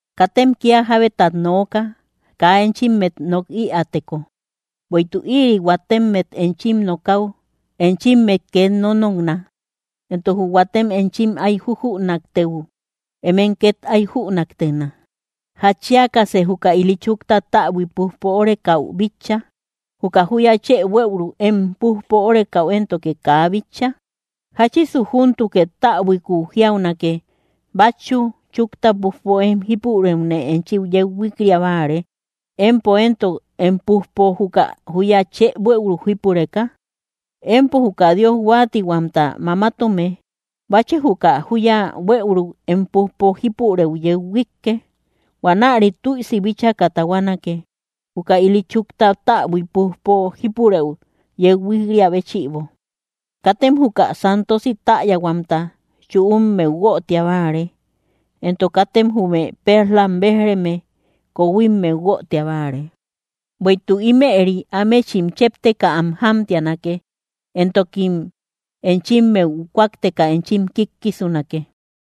’Katem kía jábetat nooka, kaa enchimmet nok ïäteko. Bueïtuk ïri huatemmet enchim nokäu enchimmet két nónokna, entok jü huatem enchim áy jujünaktëu emem két áy jünaktena. ¿Jatchiakasë juka ili chukta täbui pújpo órekäu bitcha, juka júya chë buëuruk em pújpo órekäu éntoke kaa bitcha? ¿Jáchisu júntukë täbuikuu jiaunake: “Bátchu chúkta pújpo em jípurëune enchi yeu huik‑ria báare”, empo éntok em pújpo juka júya chë buëuruk jípureka? ¡Empo juka Dios huáatihuamta mamatome! Báchë juka júya buëuruk em pújpo jípurëu yeu huíkke. Huanäre tüisi bíchaka tahuanake juka ili chúkta täbui pújpo jípurëu yeu huik‑riä béchïbo. ’Katem juka santosi täyahuamta chüummeu guötia báare, entok katem jume perlam béj‑reme kohuimmeu guötia báare, bueïtuk ímëri ámechim chépteka am jámtianake, entokim enchimmeu kúakteka enchim kíkkisunake.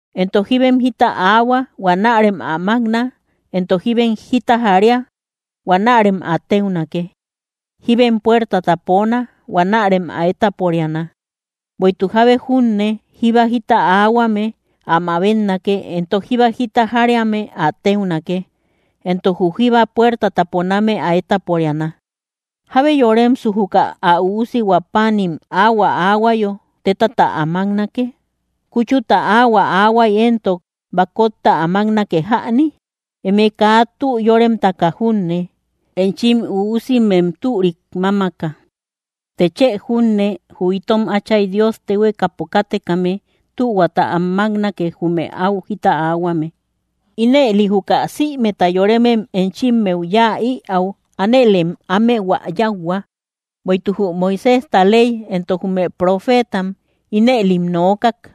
’Entok jibem jita aahua, huanärem ä mákna; entok jibem jita jaria, huanärem ä téunake; jiben puertata poona, huanärem ä étaporiana. Bueïtuk jábe junne jíba jita aahuame, ä mabetnake; entok jíba jita jariame ä téunake, entok jü jíba puertata poname ä étaporiana. ¿Jábe yoremesu juka ä üusihua páanim áhuä aahuayo tétata ä máknake? ¿Kúchuta áhuä aahuay éntok bakotta ä máknake jäni? Eme, kaa tü yórememtaka junne, enchim üusimem türik mámaka, të chë junne jü itom Áchay Dios téhuekapo kátekame tühuata am máknake jume áu jita aahuame. ’Ínëli, juka sïmeta yoremem enchimmeu yáa ïäu ánëlem ámehua yáuhua; bueïtuk jü Moiséjta ley entok jume profeetam ínëlim nookak.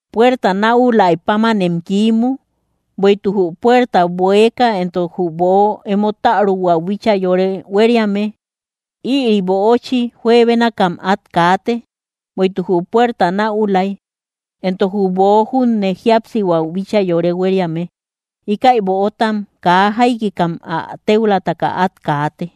’Puerta näulay pámanem kiimu. Bueïtuk jü puerta bueeka entok jü böo emo täruhuäu bíchaa yore huériame, ïri böochi juebénakam át kaate; bueïtuk jü puerta näulay entok jü böo junne jíapsihuäu bíchaa yore huériame; íkäi böotam kaa jaikikam ä téulataka át kaate.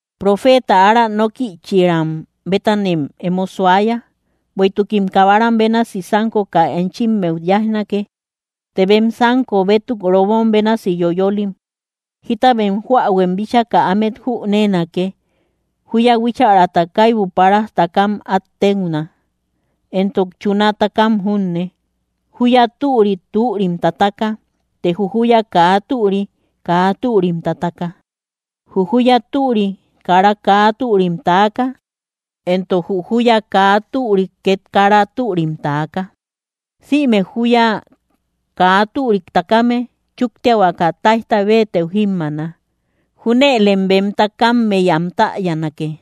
’Profeeta ára nókïchiram bétanem emo suaya. Bueïtukim kabaram bénasi sánkoka enchimmeu yáijnake, tem bem sánko bétuk robom bénasi yoyolim. Jíta bem joähuem bíchaka ámet jüneenake, júya huíchärat kaibu páras takam át téuna, entok chuna takam junne. Júya türi, türim tataka, të jü júya kaa türi kaa türim tataka. Jü júya türi kara kaa türim taaka, entok jü júya kaa türi két kara türim taaka. Sïme júya kaa türik takame chúktiahuaka táijta béetëu jímmaana. Júnëlem bem takammey am täyanake.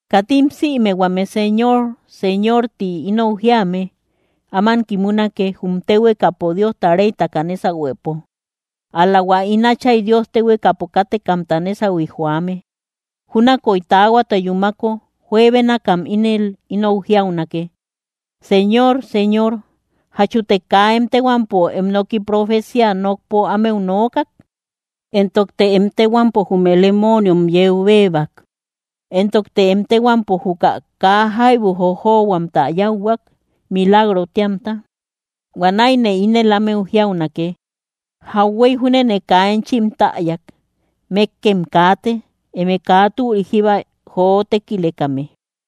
’Katim sïme huame “Señor, Señor”, ti inou jíame áman kimunake, jum téhuekapo Diosta réytaka nésahuepo, ál‑la hua ín Áchay Dios téhuekapo kátekamta nésahui joame. Júnakoy taahuata yúmako juebénakam ínel inou jiaunake: “Señor, Señor, ¿jachute kaa em téhuampo em noki profeciá nokpo ámeu nookak? Entokte em téhuampo jume lemooniom yeu béebak, entokte em téhuampo juka kaa jaibu jojohuamta yáuhuak, milagro téamta.” Huanäine ínel ámeu jiaunake: “Jauhuey júnene kaa enchim täyak. ¡Mékkem kaate, eme kaa türik jíba joo tékilekame!”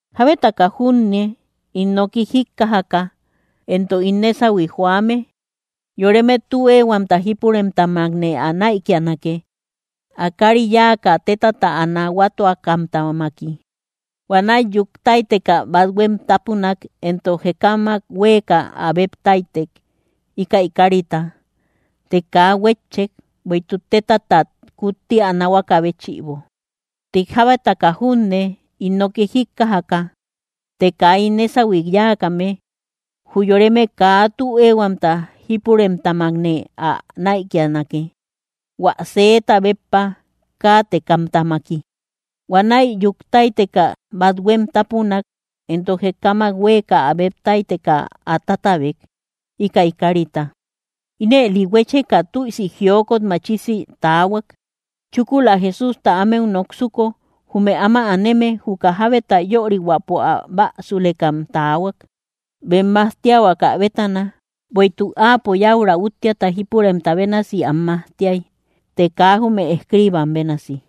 ’Jábetaka junne ín noki jíkkajaka entok ín nésahui joame, yoreme tü éehuamta jípuremtamakne ä näikianake, ä kári yáaka tétata ä nahuatuakamtamaki. Huanäi yúk táyteka, bathuem tápunak entok jekamak huéeka ä béb táytek, íkäi kárita; të kaa huétchek, bueïtuk tétatat kutti ä nahuakä béchïbo. Të jábetaka junne ín noki jíkkajaka, të kaa ín nésahui yáakame, jü yoreme kaa tü éehuamta jípuremtamakne ä näikianake, hua sëeta béppa káatekamtamaki. Huanäi yúk táyteka, bathuem tápunak entok jekamak huéeka ä béb táyteka ä tátabek, íkäi kárita; ínëli huécheka tüisi jiokot machisi taahuak. Chúkula Jesústa ámeu noksuko, jume áma aneme, juka jábeta yörihuäpo ä bäsulekam taahuak, bem majtiahuakä bétana, bueïtuk Áapo yäura úttiata jípuremta bénasi am majtiay, të kaa jume escriibam bénasi.